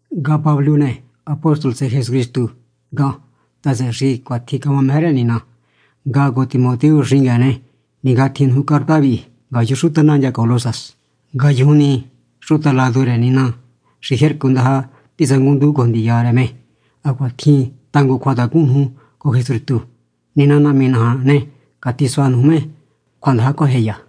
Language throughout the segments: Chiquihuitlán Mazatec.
Ngahan Pablo ne, apóstol tsëhë Jesucristu ngahan ta, tsëhë xi cuatjin camameje rë Nina. Ngahan cojo Timoteo xingueen ne, ningátjin nuju carta vihi ngayun xuta nandya Colosas, ngayujun ni xuta ladu rë Nina xi jercu ndaja titsangunndujun cojo ndiya rë me hacuaha tjin tangun cjuatacun nuju cojo Jesucristu. Nina Nahmi naja ne, catisua nuju me cjuandaja cjuajeya.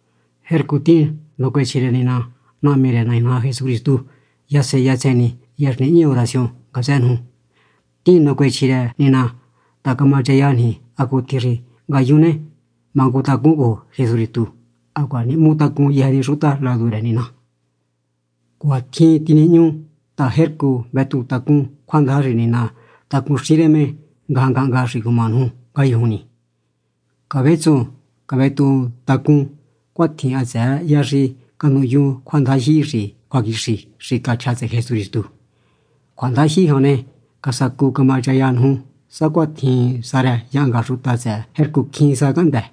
Jercu tihín nacuechji rë Nina Nahmi rë Nai naja Jesucristu yasen yasen ni, hya xi nihñi oración ngatsë nuju. Tihín nacuechji rë Nina ta camachaya niji hacutjin xi ngayun ne, mangutacún cojo Jesucristu hacuaha nihmutacún yëjë ni xuta ladu rë Nina. Cuatjin tinihñu ta, jercu vetuhun tacún cjuandaja xi Nina tacunxin rë me ngajan ngahnga xi cuma nuju ngayujun ni. Cavetsuhun cavetuhun tacún cuatjin, hatsëë hya xi canuhyun cjuandajyihi xi cjuaquixi, xi chja tsëhë Jesucristu. Cjuandajyihi jan ne, casacu camachaya nuju sacuatjin sa rë yahnga xuta tsëhë jercu cjín sa cahndë́.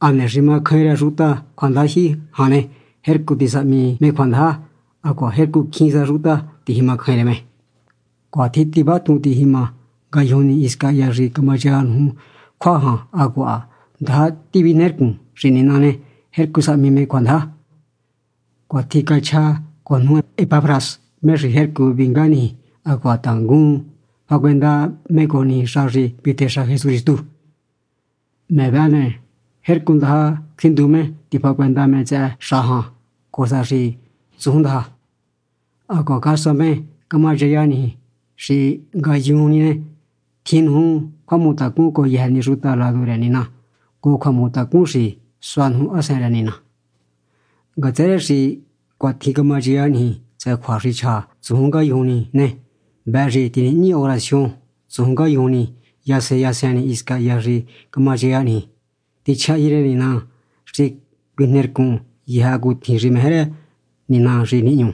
Hane xi macjain rë xuta cjuandajyihi jan ne, jercu tisahmi me cjuandaja, hacuaha jercu cjín sa xuta tijimacjain rë me. Cuanitjin tivatju ngajñi nuju ngayujun ni, hisca hya xi camachaya nuju cjua jan hacuaha ndaja cavijnercun xi Nina ne, jercu sahmi me cjuandaja. Cuatjin cachja cojo nuju Epafras, me xi jercu vinga niji hacuaha tangun fahacuenda me cojo niji xa xi vitexa Jesucristu. Me vëhë ne, jercu ndaja cjuinduju me tifahacuenda me tsëhë xa jan cojo sa xi tsujun ndaja. Hacuaha casua me camachaya niji xi ngayujun ni ne, tjin nuju cjuahmutacun cojo yëjë ni xuta ladu rë Nina, cojo cjuahmutacun xi sua nuju Hasen rë Nina. Ngatsë rë xi cuatjin camachaya niji tsëhë cjua xi chja tsujun ngayujun ni ne, vëhë xi tinihñi oración tsujun ngayujun ni yasen yasen ni hisca hya xi camachaya niji. Tichjahyin rë Nina xi cuijnercun yëjë hacutjin xi meje rë Nina xi nihñu.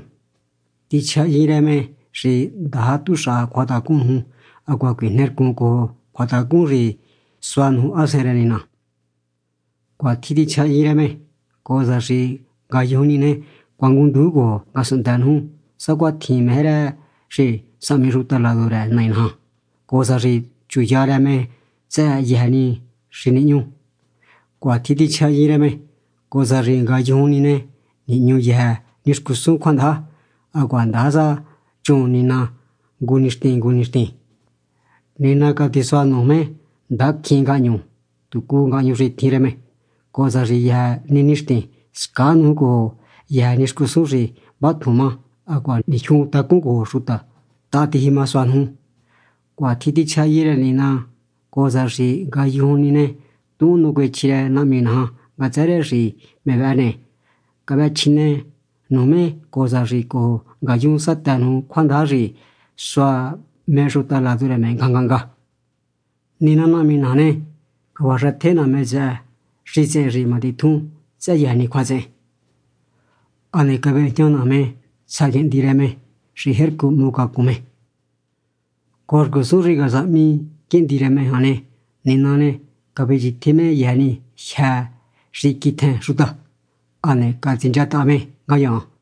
Tichjahyin rë me xi ndaja tuxaha cjuatacun nuju hacuaha cuijnercun cojo cjuatacun xi sua nuju Hasen rë Nina. Cuatjin tichjahyin rë me, cojo sa xi ngayujun ni ne, cuangunndujun cojo ngasunhndë nuju sacuatjin meje rë xi sahmi xuta ladu rë Nai naja, cojo sa xi chuya rë me tsëhë yëjë ni xi nihñu. Cuatjin tichjahyin rë me, cojo sa xi ngayujun ni ne, nihñu yëjë ni xcusun cjuandaja, hacuaha ndaja sa chun Nina ngu nixtin ngu nixtin. Nina catisua nuju me ndaja cjín ngahñu, tucu ngahñu xi tjin rë me, cojo sa xi yëjë ni nixtin scaa nuju cojo yëjë ni xcusun xi vatjun má hacuaha nijyun tacún cojo xuta, táha tijimasua nuju. Cuatjin tichjahyin rë Nina, cojo sa xi ngayujun ni ne, tuhun nacuechji rë Nahmi naja ngatsë rë xi me vëhë ne, cavëhëchjine nuju me cojo sa xi cojo ngayun satë nuju cjuandaja xi sua me xuta ladu rë me ngajan ngahnga. Nina Nahmi naja ne, cavaxëtje naja me tsëhë xitsehen xi matitjun tsëhë yëjë ni cjuatsehen, hane cavejña naja me tsja Quihndi rë me xi jercu hmucacun me. Cojo xcusun xi casahmi Quihndi rë me jan ne, Nina ne, cavechjitje me yëjë ni jyë́ xi quitjen xuta, hane catsinchataha me ngayaan.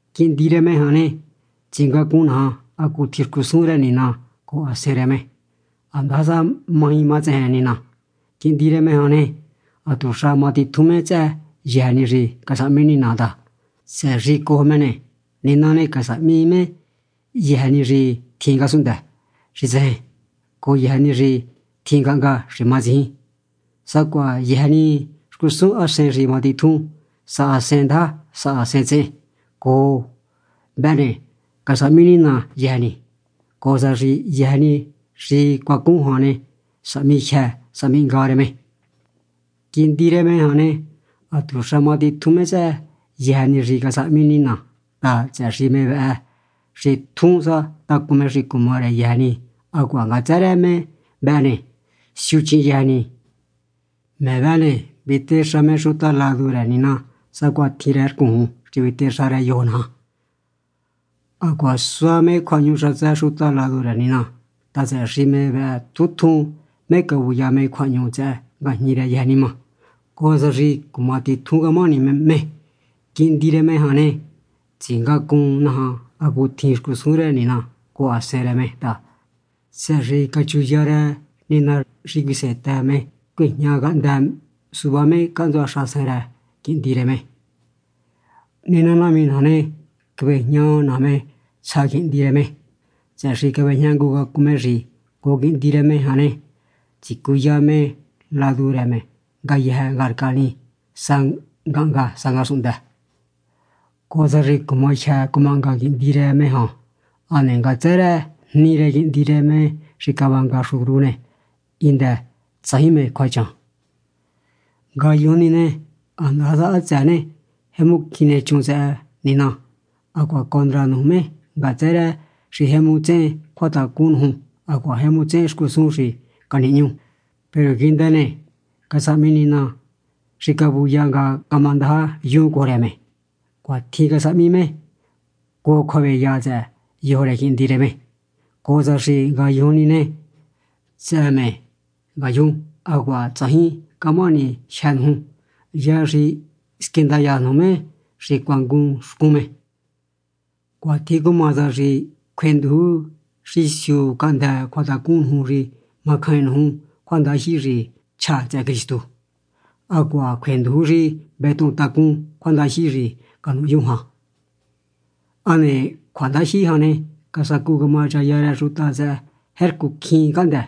Quihndi rë me jan ne, tsingacun naja hacutjin xcusun rë Nina cojo Hasen rë me, handasa maji matsejen Nina. Quihndi rë me jan ne, hatuxa matitjun me tsëhë yëjë ni xi casahmi Nina ta, tsëhë xi cojo me ne, Nina ne, casahmi me yëjë ni xi tjin ngasunhndë xi tsejen, cojo yëjë ni xi tjin ngahnga xi matsijin, sacuaha yëjë ni xcusun hasen xi matitjun sa hasen ndaja sa hasen tsehen. Cojo me vëhë ne, casahmi Nina yëjë ni, cojo sa xi yëjë ni xi cuacun jan ne, sahmi jyë sahmi hnga rë me. Quihndi rë me jan ne, hatuxa matitjun me tsëhë yëjë ni xi casahmi Nina ta, tsëhë xi me vëhë xi tjun sa tacun me xi cuma rë yëjë ni hacuaha ngatsë rë me vëhë ne, siuchihin yëjë ni. Me vëhë ne, vitexa me xuta ladu rë Nina sacuatjin rë rcuun xi vitexa rë yojo naja. Hacuaha sua me cjuahñu xatsë xuta ladu rë Nina ta, tsëhë xi me vëhë tjun tjun me cavuya me cjuahñu tsëhë ngajñi rë yëjë nima, cojo sa xi cumatitjun camahani me. Quihndi rë Nina jan ne, tsingacun naja hacutjin xcusun rë Nina cojo Hasen rë me ta, tsëhë xi cachuya rë Nina xi cuisehentë me cuejñacahndë suvá me cahntsua xahasen rë Quihndi rë me. Nina Nahmi naja ne, cavejña naja me tsja Quihndi rë me, tsëhë xi cavejñangucacun me xi cojo Quihndi rë me ne, tsicuya me ladu rë me ngayëjë ngarca ni, sa ngahnga sa ngasunhndë, cojo sa xi cumajyë cumahnga Quihndi rë me jan. Hane ngatsë rë jni rë Quihndi rë me xi cavanga xcun cru ne, hindë tsajin mé cjuachan. Ngayujun ni ne, handasa hatsëë ne, jemu cjin nechun tsëhë Nina hacuaha condra nuju me ngatsë rë xi jemu tsehen cjuatacun nuju hacuaha jemu tsehen xcusun xi canihñu, peru quihndë ne, casahmi Nina xi cavuya nga camandaja yun cojo rë me. Cuatjin casahmi me cojo cjuaveya tsëhë yojo rë Quihndi rë me, cojo sa xi ngayujun ni ne, tsëhë me yun hacuaha tsajin camahani jyë́ nuju, hya xi squindaya nuju me xi cuangun xcun me. Cuatjin cuma sa xi cjuenduju xi siu cahndë́ cjuatacun nuju xi macjain nuju cjuandajyihi xi chja tsëhë Cristu, hacuaha cjuenduju xi vetuhun tacún cjuandajyihi xi canuhyun jan. Hane cjuandajyihi jan ne, casacu camachaya rë xuta tsëhë jercu cjín cahndë́.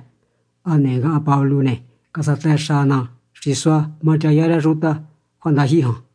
Hane ngahan Pablo ne, casatëxa ná xi suá machaya rë xuta cjuandajyihi jan.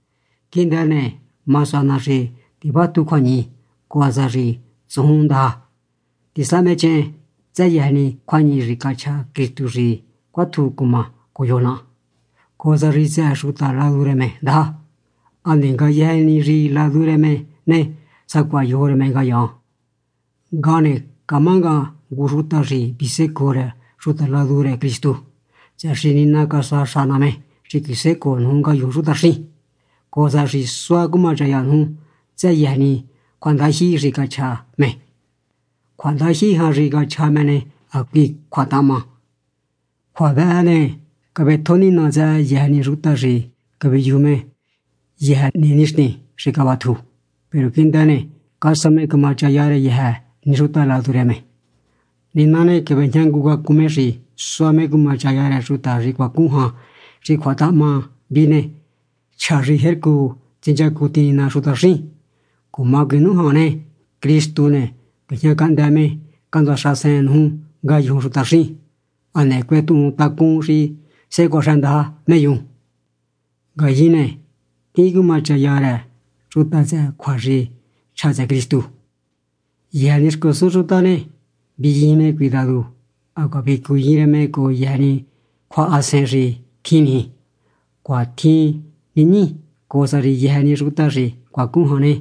Quihndë ne, ma sua ná xi tivátju cjuañihi cojo sa xi tsujun ndaja. Tisahmechehen tsëhë yëjë ni cjuañihi xi cachja Cristu xi cuátju cuma cojo yojo naha, cojo sa xi tsëhë xuta ladu rë me ndaja, hane ngayejen ni xi ladu rë me ne, sacuaha yojo rë me ngayaan. Ngahan ne, camá ngahan ngu xuta xi visécoo rë xuta ladu rë Cristu, tsëhë xi Nina casuaxa ná me xi cuisécoo nuju ngayun xutaxín, cojo sa xi suá cumachaya nuju tsëhë yëjë ni cjuandajyihi xi cachja me. Cjuandajyihi jan xi cachja me ne, hacui cjuatahahma. Cjua vëhë ne, cavetjo Nina tsëhë yëjë ni xuta xi caviyuju me yëjë ni nixtin xi cavatju, peru quihndë ne, casua me camachaya rë yëjë ni xuta ladu rë me. Nina ne, cavejñangucacun me xi sua me cumachaya rë xuta xi cuacun jan xi cjuatahahma vihi ne, chja xi jercu tsinchacuntihin Nina xutaxín jan. Cuma cuinújan ne, Cristu ne, cuejñacahndë me cahntsua xahasen nuju ngayun xutaxín. Hane cuetuhun tacún xi sehe cuaxëndaja me yun. Ngayin ne, tihín cumachaya rë xuta tsëhë cjua xi chja tsëhë Cristu. Yëjë ni xcusun xuta ne, viyijin me cuidadu hacuaha vicuyin rë me cojo yëjë ni cjuahasen xi tjin niji. Cuatjin nihñi, cojo sa xi yëjë ni xuta xi cuacun jan ne,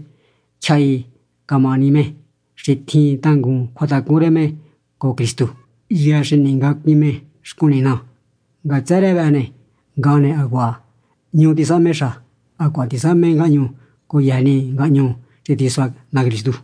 tyjahi camahani me xi tjin tangun cjuatacun rë me cojo Cristu, hya xi ningacuin me xcun Nina. Ngatsë rë vëhë ne, ngahan ne, hacuaha hñu tisahme xa, hacuaha tisahme ngahñu cojo yëjë ni ngahñu xi tisua ná Cristu.